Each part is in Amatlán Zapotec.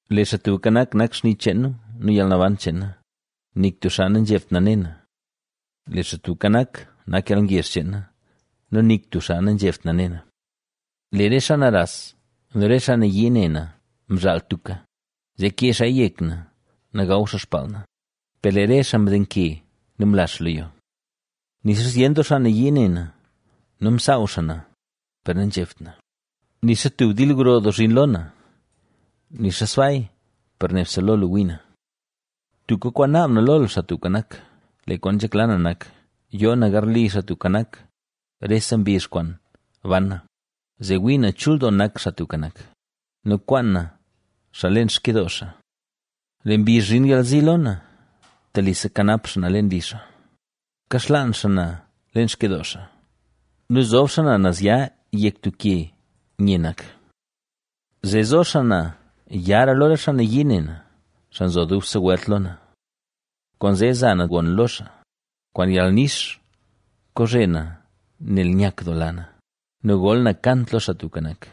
Lee Xaa Tubka Nak, nak xni cheen na nu yalnaban cheen na, nik tub xaa nazhebt na ne na. Lee Xaa Tubka Nak, nak yalngezh cheen na nu nik tub xaa nazhebt na ne na. Lee re xaa naras nu re xaa nayii ne na mzhaal tuka, zee kee xaaya yek na nu gaw xaa xpaal na, per lee re xaa mdenke nu mla xaa lo yo. Nixa zyen doo xaa nayii ne na nu msaaw xaa na, per nazhebt na; nixa tub dil gro doo zhin lo na, nixa sbaaya per nebse lo lu wii na. Tuka kwaan naab na lo Xaa Tubka Nak, lee kwaan nzhekla na nak: Yoo na garli Xaa Tubka Nak, rese mbizh kwaan ban na, zee wii na chul doo nak, Xaa Tubka Nak, nu kwaan na xaa leen xkyidoo xaa. Lee mbizh zhin yalzi lo na, telise kanap xaa na leen li xaa; kaxlaan xaa na leen xkyidoo xaa nu zob xaa na nazya yek tub ke nye nak. Zee zo xaa na yara lo re xaa nayii ne na, xaa nzo dubse welt lo na. Kwaanzee za na gon lo xaa, kwaan yalnix kozhe na nel nyakdoola na, nu gol na kant lo Xaa Tubka Nak.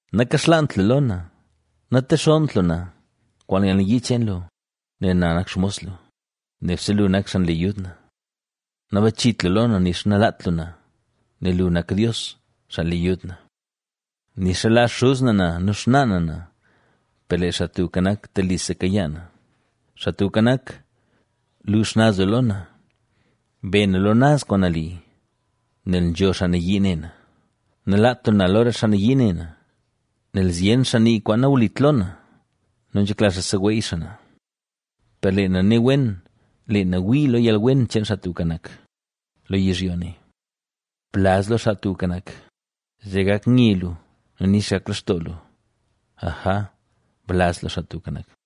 Nakaxlaant lu lo na, natexonnt lu na, kwaan yalnayii cheen lu, nel na nak xmos lu, nebse lu nak xaa nle yud na. Nabachit lu lo na, nixa nalaat lu na, nel lu nak Dios, xaa le yud na. Nixa laa xuz na na nu xnaa na na, per lee Xaa Tubka Nak, telise kayaa na. Xaa Tubka Nak, lu xnaz lu lo na, be na lo naz kwaan nali, nel nzho xaa nayii ne na. Nalaat lu na lo re xaa nayii ne na, nel zyen xaa nii kwaan nawlit lo na nu nzhekla xaa seweey xaa na. Per lee na ne wen, lee na wii lo yalwen cheen Xaa Tubka Nak, lo yizhyo ne. Blaz lo Xaa Tubka Nak; zee gak nye lu nu nix gak lextoo lu ¡Aja, blaz lo Xaa Tubka Nak!